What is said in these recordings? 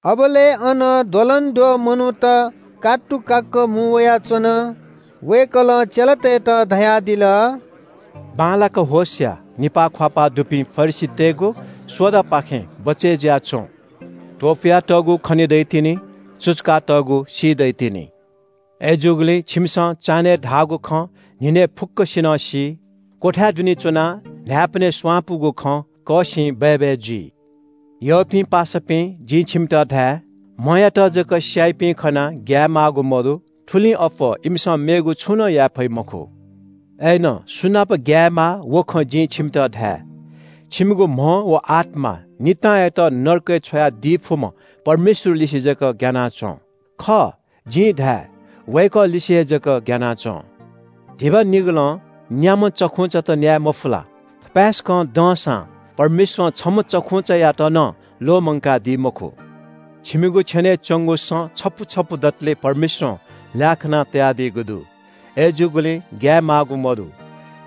अबलय् अन द्वलंद्वः मनूत कात्तुकाक्‍क मुं वयाच्‍वन। वय्‌कलं चेलातय्‌त धयादिल – “बांलाक होश या। निपाः ख्‍वाःपाः दुपिं फरिसीतय्‌गु सोडापाखें बचय् जुयाच्‍वँ। त्‍वपुयातःगु खने दइतिनि। सुचुकातःगु सी दइतिनि। अय्‌जूगुलिं छिमिसं चान्‍हय् धाःगु खँ न्‍हिनय् फुक्‍कसिनं सी। क्‍वथाय् दुने च्‍वनाः न्‍हाय्‌पनय् स्‍वांपूगु खँ कःसिं बय्‌बय् जुइ।” “यःपिं पासापिं, जिं छिमित धाये – म्‍हयात जक स्‍याइपिं खनाः ग्‍याये माःगु मदु। थुलिं अप्‍वः इमिसं मेगु छुं नं याये फइ मखु। अय्‌नं सु नाप ग्‍यायेमाः व खँ जिं छिमित धाये – छिमिगु म्‍ह व आत्‍मा नितांयात नरकय् छ्वयादी फुम्‍ह परमेश्‍वरलिसे जक ग्‍याना च्‍वँ। खः, जिं धाये – वय्‌कःलिसे हे जक ग्‍याना च्‍वँ। “धिबा निगलं न्‍याम्‍ह चखुंचात न्‍याये मफु ला? थपाय्‌सकं दंसां परमेश्‍वरं छम्‍ह चखुंचायात नं ल्‍वःमंकादी मखु। छिमिगु छेनय् च्‍वंगु सँ छपु छपु दतले परमेश्‍वरं ल्‍याः खाना तयादीगु दु। अय्‌जूगुलिं ग्‍याये माःगु मदु।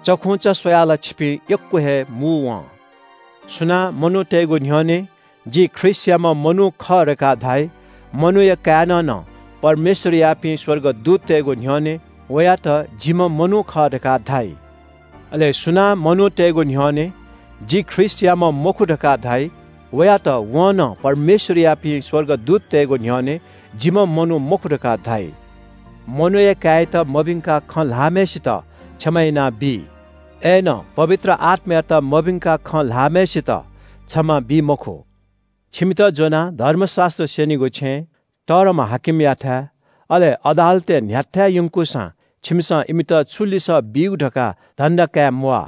चखुंचा स्‍वयाः ला छिपिं यक्‍व हे मू वं।” “सुनां मनूतय्‌गु न्‍ह्यःने ‘जि ख्रीष्‍टयाम्‍ह मनू खः’ धकाः धाइ, मनूया काय्‌नं नं परमेश्‍वरयापिं स्‍वर्गदूततय्‌गु न्‍ह्यःने वयात ‘जिम्‍ह मनू खः’ धकाः धाइ। अले सुनां मनूतय्‌गु न्‍ह्यःने ‘जि ख्रीष्‍टयाम्‍ह मखु’ धकाः धाइ वयात वं नं परमेश्‍वरयापिं स्‍वर्गदूततय्‌गु न्‍ह्यःने ‘जिम्‍ह मनू मखु’ धकाः धाइ। मनूया काय्‌यात मभिंकाः खँ ल्‍हाःम्‍हय्‌सित क्षमा यानाबी, अय्‌नं पवित्र आत्‍मायात मभिंकाः खँ ल्‍हाःम्‍हय्‌सित क्षमा बी मखु। “छिमित ज्‍वनाः धर्मशास्‍त्र स्‍यनीगु छेँ, तःधंम्‍ह हाकिमयाथाय्, अले अदालतय् न्‍ह्याथाय् यंकूसां छिमिसं इमित छु लिसः बीगु धकाः धन्‍दा काये म्‍वाः।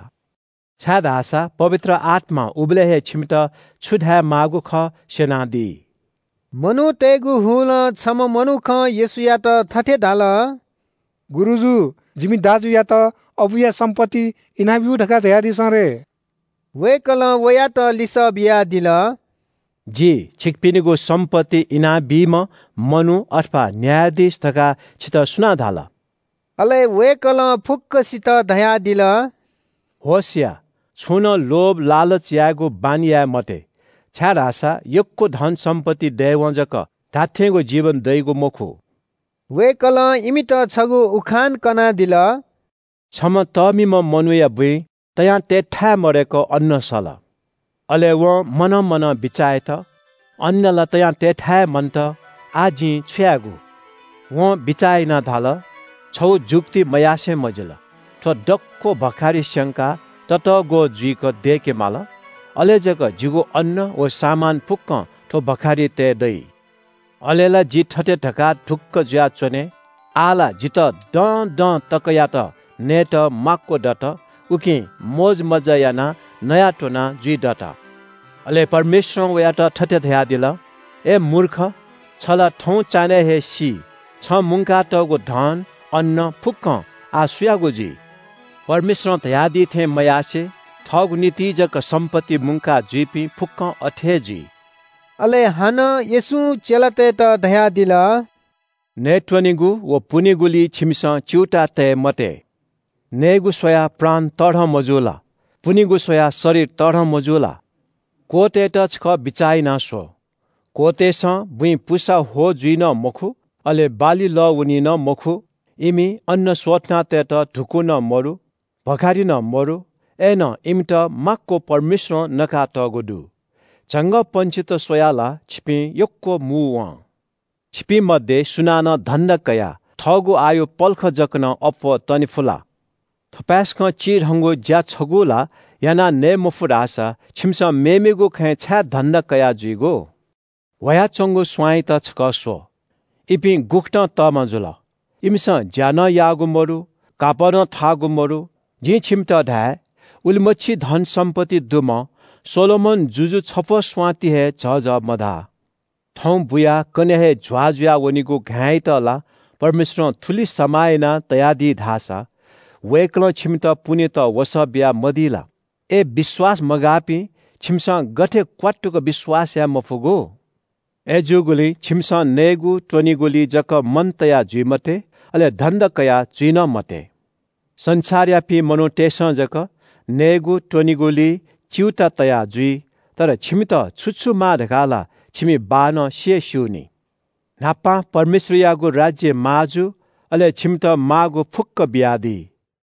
छाय्‌धाःसा पवित्र आत्‍मां उबलय् हे छिमित छु धायेमाःगु खः स्‍यनादी।” मनूतय्‌गु हुलं छम्‍ह मनुखं येशूयात थथे धाल – “गुरुजु, जिमि दाजुयात अबुया सम्‍पत्ति इनाब्‍यु धकाः धयादिसँ रे।” वय्‌कलं वयात लिसः बियादिल – “जि छिकपिनिगु सम्‍पत्ति इनाबीम्‍ह मनू अथवा न्‍यायाधीश धकाः छितः सुनां धाल?” अले वय्‌कलं फुक्‍कसित धयादिल – “होश या, छुं नं लोभ लालच यायेगु बानी याये मते, छाय्‌धाःसा यक्‍व धनसम्‍पत्ति दयेवं जक धात्‍थेंगु जीवन दइगु मखु।” वय्‌कलं इमित छगू उखान कनादिल। “छम्‍ह तःमिम्‍ह मनूयागु बुँइ तयां तयेथाय् मदय्‌क अन्‍न सल। अले वं मनं मनं बिचाः यात – ‘अन्‍न ला तयां तयेथाय् हे मन्‍त, आः जिं छु यायेगु?’ वं बिचाः यानाः धाल – ‘छगू जुक्ति मयासें मजिल। थ्‍व दक्‍व भखारि स्‍यंकाः ततःग्‍वः जुइक दय्‌केमाल, अले जक जिगु अन्‍न व सामान फुक्‍कं थ्‍व भखारिइ तये दइ। अले ला जि थथे धकाः ढुक्‍क जुयाच्‍वने – “आः ला जितः दँदं तकयात नयेत माक्‍व दत। उकिं मोजमज्‍जा यानाः नयाःत्‍वनाः जुइदत।”’ “अले परमेश्‍वरं वयात थथे धयादिल – ‘अय् मूर्ख, छ ला थौं चान्‍हय् हे सी। छं मुंकातःगु धन, अन्‍न फुक्‍कं आः सुयागु जुइ?’ “परमेश्‍वरं धयादी थें मयासें थःगु निंतिं जक सम्‍पत्ति मुंका जुइपिं फुक्‍कं अथे हे जुइ।” अले हानं येशूं चेलातय्‌त धयादिल – “नयेत्‍वनेगु व पुनेगुलिइ छिमिसं च्‍यूताः तये मते। नयेगु स्‍वयाः प्राण तःधं, मजू ला? पुनेगु स्‍वयाः शरीर तःधं, मजू ला? क्‍वःतय्‌त छकः बिचाः यानाः स्‍व। क्‍वःतय्‌सं बुँइ पुसा ह्वः जुइ नं मखु, अले बाली लः वनी नं मखु। इमि अन्‍न स्‍वथना तयेत धुकू नं मदु, भखारि नं मदु। अय्‌नं इमित माक्‍व परमेश्‍वरं नका तःगु दु। झंगःपंक्षीत स्‍वयाः ला छिपिं यक्‍व मू वं। छिपिं मध्‍ये सुनानं धन्‍धा कयाः थःगु आयु पलख जक नं अप्‍वः तने फु ला? थपाय्‌सकं चिधंगु ज्‍या छगू ला याना नये मफु धाःसा छिमिसं मेमेगु खँय् छाय् धन्‍दा कयाः जुइगु? “ह्वयाच्‍वंगु स्‍वांयात छकः स्‍व, इपिं गुकथं तःमा जुल? इमिसं ज्‍या नं याःगु मदु, कापः नं थाःगु मदु। जिं छिमित धाये – उलिमछि धनसम्‍पत्ति दुम्‍ह सोलोमन जुजु छफ्‍वः स्‍वां ति हे झःझः मधाः। थौं बुयाः कन्‍हय् हे झ्‍वाः जुया वनीगु घाँय्‌यात ला परमेश्‍वरं थुलि समाः यानातयादी धाःसा वय्‌कलं छिमित पुनेत वसः बियामदी ला? अय् विश्‍वास मगाःपिं, छिमिसं गथे क्‍वात्तुक विश्‍वास याये मफुगु? “अय्‌जूगुलिं छिमिसं नयेत्‍वनेगुलिइ जक मन तया जुइ मते, अले धन्‍दा कयाजुइ नं मते। संसारयापिं मनूतय्‌सं जक नयेत्‍वनेगुलिइ च्‍यूताः तया जुइ। तर छिमित छु छु माः धकाः ला छिमि बाःनं सि हे स्‍यूनि। न्‍हापां परमेश्‍वरयागु राज्‍य माः जु, अले छिमित माःगु फुक्‍क बियादी।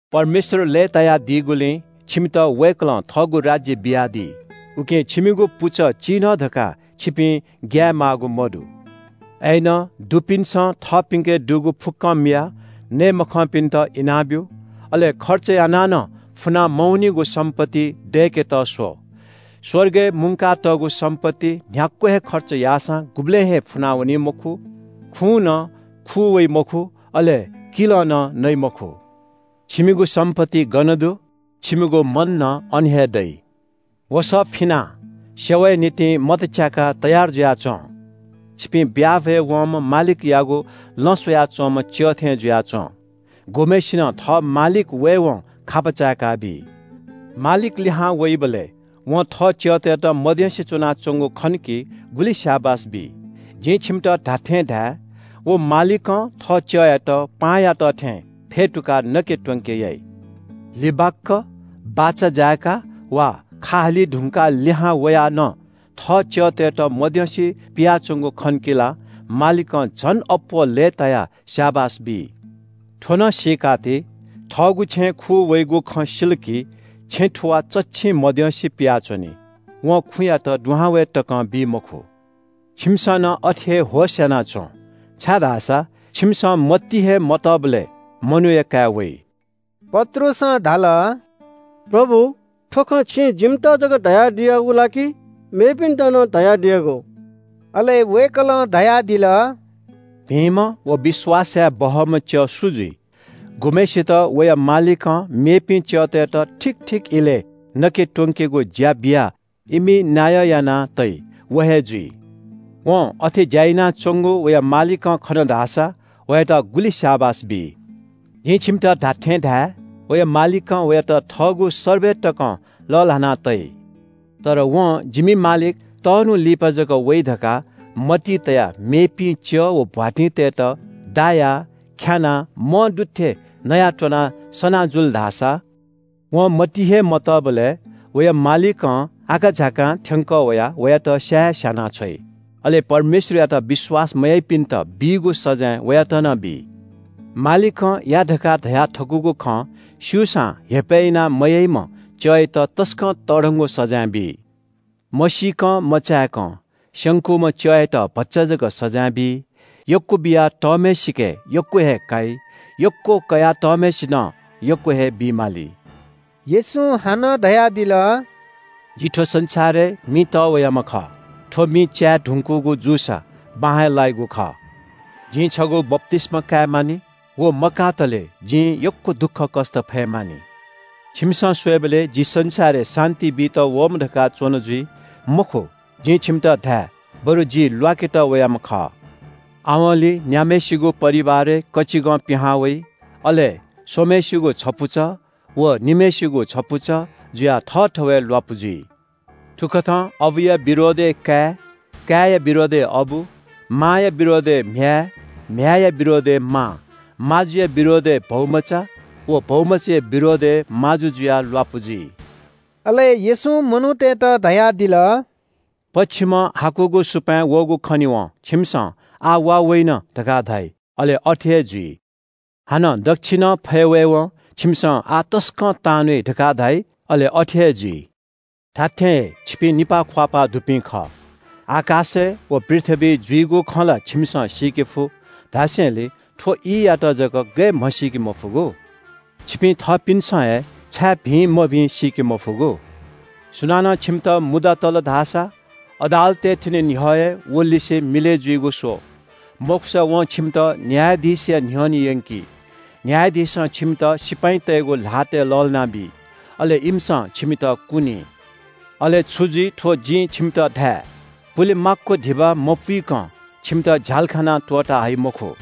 “परमेश्‍वर लय्‌तायादीगुलिं छिमित वय्‌कलं थःगु राज्‍य बियादी। उकिं छिमिगु पुचः चिधं धकाः छिपिं ग्‍याये माःगु मदु। “अय्‌नं दुपिन्‍सं थःपिन्‍के दुगु फुक्‍कं मियाः नये मखंपिन्‍त इनाब्‍यु। अले खर्च यानाः नं फुना मवनीगु सम्‍पत्ति दय्‌केत स्‍व। स्‍वर्गय् मुंकातःगु सम्‍पत्ति न्‍ह्याक्‍व हे खर्च याःसां गुबलें हे फुनावनी मखु, खुं नं खू वइ मखु, अले किलं नं नइ मखु। छिमिगु सम्‍पत्ति गन दु छिमिगु मन नं अन हे दइ।” “वसः फिनाः सेवाया निंतिं मत च्‍याकाः तयार जुयाच्‍वँ। छिपिं ब्‍याहा भ्‍वय् वंम्‍ह मालिकयागु लँ स्‍वया च्‍वंम्‍ह च्‍यः थें जुयाच्‍वँ। गुम्‍हय्‌सिनं थः मालिक वयेवं खापा चाय्‌काबी। मालिक लिहां वइबलय् वं थः च्‍यःतय्‌त मद्यंसे च्‍वनाच्‍वंगु खन कि गुलि स्‍याबास बी। जिं छिमित धात्‍थें धाये – व मालिकं थः च्‍यःयात पाहांयात थें फ्‍यतुकाः नके त्‍वंके याइ। लिबाक्‍क बाचा जाय्‌का वा खा हाली धुंकाः लिहां वयाः नं थः च्‍यःतय्‌त मद्यंसे पियाच्‍वंगु खन कि ला मालिकं झन अप्‍वः लय्‌तायाः स्‍याबास बी। “थ्‍व नं सीकाति – थःगु छेँय् खू वइगु खँ सिल कि छेँ थुवाः चच्‍छिं मद्यंसे पियाच्‍वनी। वं खुँयात दुहां वये तकं बी मखु। छिमिसं नं अथे हे होश‍यानाच्‍वँ, छाय्‌धाःसा छिमिसं मतिइ हे मतःबलय् मनूया काय् वइ।” पत्रुसं धाल – “प्रभु, थ्‍व खँ छिं जिमित जक धयादियागु ला कि मेपिन्‍त नं धयादियागु?” अले वय्‌कलं धयादिल – “भिंम्‍ह व विश्‍वास याये बहःम्‍ह च्‍यः सु जुइ? गुम्‍हय्‌सित वया मालिकं मेपिं च्‍यःतय्‌त ठीक ठीक इलय् नके त्‍वंकेगु ज्‍या बियाः इमि नायः याना तइ, व हे जुइ। वं अथे ज्‍या यानाच्‍वंगु वया मालिकं खन धाःसा वयात गुलि स्‍याबास बी। जिं छिमित धात्‍थें धाये – वया मालिकं वयात थःगु सर्बय तकं लःल्‍हाना तइ। तर वं ‘जिमि मालिक तःन्‍हु लिपा जक वइ’ धकाः मतिइ तयाः मेपिं च्‍यः व भ्‍वातिंतय्‌त दायाः ख्‍यानाः मंदु थें नयाःत्‍वनाः सनाः जुल धाःसा वं मतिइ हे मतःबलय् वया मालिकं आकाझाकां थ्‍यंकः वयाः वयात स्‍या हे स्‍यानाछ्वइ। अले परमेश्‍वरयात विश्‍वास मयाइपिन्‍त बीगु सजाँय वयात नं बी। “मालिकं या धकाः धयाथकूगु खँ स्‍यूसां हेपय् यानाः मयाइम्‍ह च्‍यःयात तसकं तःधंगु सजाँय बी। मसीकं मचाय्‌कं स्‍यंकूम्‍ह च्‍यःयात भचा जक सजाँय बी। यक्‍व बिया तःम्‍हय्‌सिके यक्‍व हे काइ, यक्‍व कयातःम्‍हय्‌सिनं यक्‍व हे बी माली।” येशूं हानं धयादिल – “जि थ्‍व संसारय् मि तःवयाम्‍ह खः। थ्‍व मि च्‍याये धुंकूगु जूसा बां हे लाइगु खः। जिं छगू बप्‍तिस्‍मा काये मानि। व मकातले जिं यक्‍व दुःखकष्‍ट फये मानि। छिमिसं स्‍वयेबलय् जि संसारय् शान्‍ति बीत वःम्‍ह धकाः च्‍वन जुइ? मखु, जिं छिमित धाये – बरु जि ल्‍वाकेत वयाम्‍ह खः। आवंलि न्‍याम्‍हय्‌सिगु परिवारय् कचिंगः पिहां वइ, अले स्‍वम्‍हय्‌सिगु छपुचः व निम्‍हय्‌सिगु छपुचः जुयाः थःथवय् ल्‍वापु जुइ। “‘थुकथं अबुया विरोधय् काय्, काय्‌या विरोधय् अबु, मांया विरोधय् म्‍ह्याय्, म्‍ह्याय्‌या विरोधय् मां, माजुया विरोधय् भौमचा, व भौमचाया विरोधय् माजु जुयाः ल्‍वापु जुइ।’” अले येशूं मनूतय्‌त धयादिल – “पच्‍छिमं हाकुगु सुपाँय् वःगु खनेवं छिमिसं ‘आः वा वइन’ धकाः धाइ, अले अथे हे जुइ। हानं दच्‍छिनं फय् वयेवं छिमिसं ‘आः तसकं तांन्‍वइ’ धकाः धाइ, अले अथे हे जुइ। धात्‍थें हे, छिपिं निपाः ख्‍वाःपाः दुपिं खः। आकाशय् व पृथ्‍वीइ जुइगु खँ ला छिमिसं सीके फु धासेंलि थ्‍व ईयात जक गय् म्‍हसीके मफुगु? “छिपिं थःपिन्‍सं हे छाय् भिं मभिं सीके मफुगु? सुनानं छिमित मुद्दा तल धाःसा अदालतय् थ्‍यने न्‍ह्यः हे वलिसे मिलय् जुइगु स्‍व। मखुसा वं छिमित न्‍यायाधीशया न्‍ह्यःने यंकी। न्‍यायाधीशं छिमित सिपाइँतय्‌गु ल्‍हातय् लःल्‍हानाबी। अले इमिसं छिमित कुनी। अले छु जुइ थ्‍व जिं छिमित धाये – पुले माक्‍व धिबा मपुइकं छिमित झ्‍यालखानां त्‍वःता हइ मखु।”